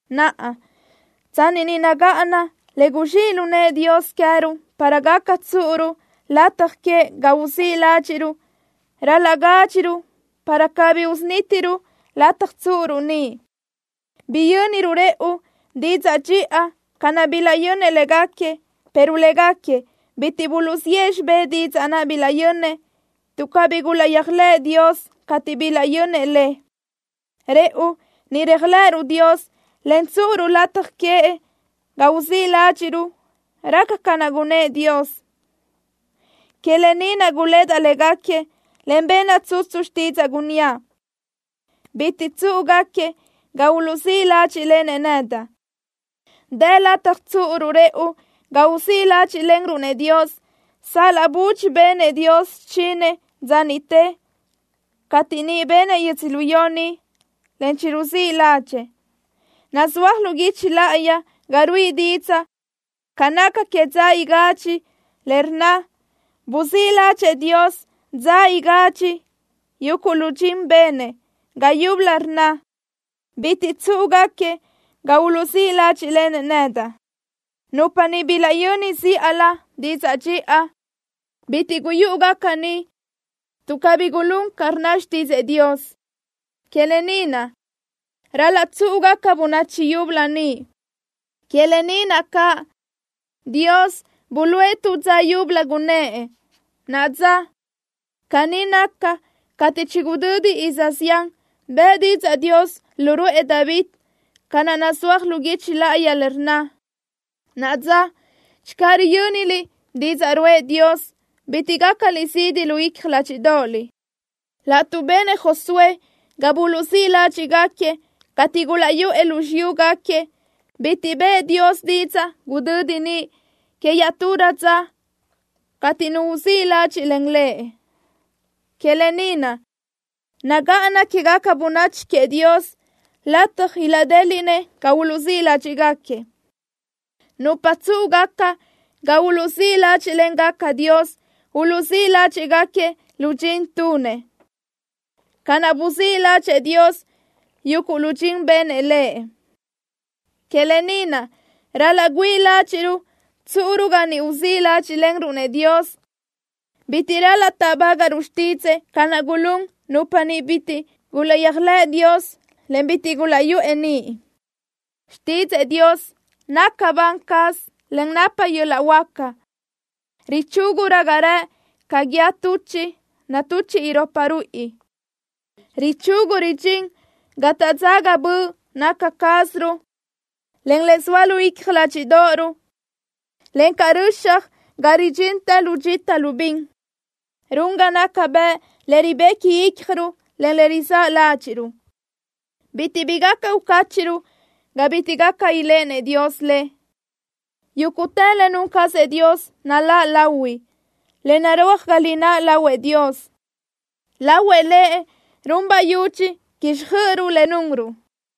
Naʼa, tsanni ni nagáʼana le guzxíʼ lu nëʼë Dios queë́ruʼ para gaca tsúʼuruʼ lataj queëʼ ga uzíʼ ládxiʼruʼ, ral-laʼ gádxiruʼ para cabí unítiruʼ lataj tsúʼuruʼ niʼ. Biyönruʼ rëʼu didzaʼ dxiʼa ca naʼ bilaʼyönnëʼ légaquiëʼ, pero légaquiëʼ bitiʼ buluʼziʼë xibé didzaʼ naʼ bilaʼyönnëʼ, tuʼ cabí gulaʼyéajlëʼë Dios cateʼ bilaʼyönnëʼ le. Rëʼu ni réajlëʼëruʼ Dios, en tsúʼuruʼ lataj queëʼ ga uzíʼ ládxiʼruʼ. Raca ca naʼ gunnë́ʼ Dios: Que lë ni naʼ gulédaʼ légaquiëʼ en benaʼ tsutsu xtídzaʼa, gunníaʼ: Bitiʼ tsúʼugaquiëʼ ga uluʼzíʼ ládxiʼlenëʼ nedaʼ. Dë lataj tsúʼuruʼ rëʼu ga uzíʼ ládxiʼlenruʼ-nëʼ Dios, sal-laʼ budxi benëʼ Dios xichinëʼ dza niʼte cateʼ niʼ benëʼ yödzölió ni, en chiruzíʼ ládxëʼë. Nazúaj lu guichi láʼayi ga ruíʼi didzaʼ ca naca que dza igadxi, le rnna: “Buzíʼ ládxëʼë Dios dza igadxi yuguʼ lu dxin benëʼ.” Ga yúbölö rnna: “Bitiʼ tsúʼugaquiëʼ ga uluʼzíʼ ládxiʼlenëʼ nedaʼ.” Nupa niʼ bilaʼyöni zíʼalö didzaʼ dxiʼa, bitiʼ guyúʼugaca niʼ tuʼ cabí gulún ca rnna xtídzëʼë Dios. Que lë ni naʼ, ral-laʼ tsúʼugaca bönachi yúbölö niʼ. Que lë ni naʼ caʼ, Dios buluʼe tu dza yúbölö, gunnë́ʼ: “Naʼa dza.” Caní naca, cateʼ chigudödi iz zián, bëʼë didzaʼ Dios lu ruʼë David, ca naʼ nazúaj lu guichi láʼayi le rnna: Naʼa dza, channö riyö́niliʼ didzaʼ ruʼë Dios, bitiʼ gácaliʼ zidi lu icja ládxiʼdoʼoliʼ. Laʼtuʼ benëʼ Josué ga buluʼzíʼ ládxiʼgaquiëʼ cateʼ gulaʼyuʼë lu xiyúgaquiëʼ, bitiʼ bëʼë Dios didzaʼ gudödi niʼ que iaʼturö dza cateʼ nu uzíʼ ládxiʼlen Lëʼ. Que lë ni naʼ, nagáʼana quégaca bönachi queëʼ Dios lataj ilaʼdéliʼnëʼ ga uluʼzíʼ ládxiʼgaquiëʼ. Nupa tsúʼugaca ga uluʼzíʼ ládxiʼlengaca Dios, uluʼzíʼ ládxiʼgaquiëʼ lu dxin tunëʼ, ca naʼ buzíʼ ládxëʼë Dios yuguʼ lu dxin benëʼ Lëʼ. Que lë ni naʼ, ral-laʼ güíʼi ládxiʼruʼ tsúʼuruʼ ga niʼ uzíʼ ládxiʼlenruʼ-nëʼ Dios. Bitiʼ ral-laʼ táʼbagaʼruʼ xtídzëʼë ca naʼ gulún nupa niʼ bitiʼ gulaʼyéajlëʼ Dios, en bitiʼ gulaʼyuʼë niʼ. Xtídzëʼë Dios naca ban caz, en napa caz yöl-laʼ huáca. Richúgurö ga rëʼ ca guíë tuchiʼ natuchiʼ iropa ruíʼi. Richugu ridxín ga taʼdzaga böʼ naca cázaruʼ, en le zoa lu icja ládxiʼdoʼoruʼ, encaʼ röxaj ga ridxintë lu dxita lu bin. Run ga naca bëʼ le ribequi ícjaruʼ, en le rizáʼ ládxiʼruʼ. Bitiʼ bi gaca ucáchiʼruʼ ga bitiʼ gaca iléʼenëʼ Dios le. Yúguʼtë le nun cazëʼ Dios naláʼ lahui, en narúaj ga lináʼ lahuëʼ Dios. Lahuëʼ Lëʼ run bayudxi quíxjöʼöruʼ le nunruʼ.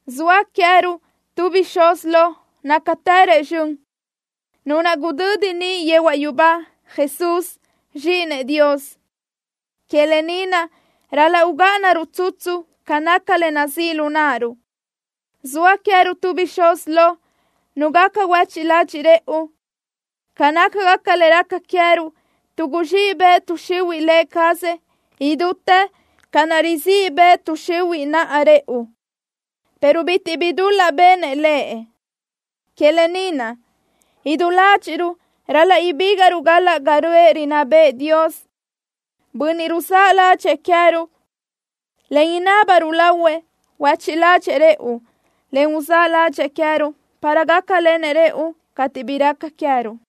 Zoa queë́ruʼ tu bixúz lo, nácatërëʼ zxön, Nu naʼ gudödi niʼ yehuaʼ yubá, Jesús, Zxíʼinëʼ Dios. Que lë ni naʼ ral-laʼ ugáʼanaruʼ tsutsu ca naca le nazíʼ lu náʼaruʼ. Zoa queë́ruʼ tu bixúz lo, Nu gaca huéchiʼ ladxiʼ rëʼu ca nácagaca le raca queë́ruʼ, tuʼ guzxíʼ bëʼ tuʼ xihuiʼ Lë cazëʼ idútë ca naʼ rizíʼ bëʼ tuʼ xihuiʼ naʼ rëʼu, pero bitiʼ bi dul-laʼ benëʼ Lëʼ. Que lë ni naʼ, idú ládxiʼruʼ ral-laʼ ibígaʼruʼ galaʼ ga röʼë rinná bëʼë Dios, Bönniʼ ruzáʼ ladxëʼë queë́ruʼ, en inábaruʼ lahuëʼ huéchiʼ ládxëʼë rëʼu, en uzáʼ ládxëʼë queë́ruʼ, para gácalenëʼ rëʼu cateʼ bi raca queë́ruʼ.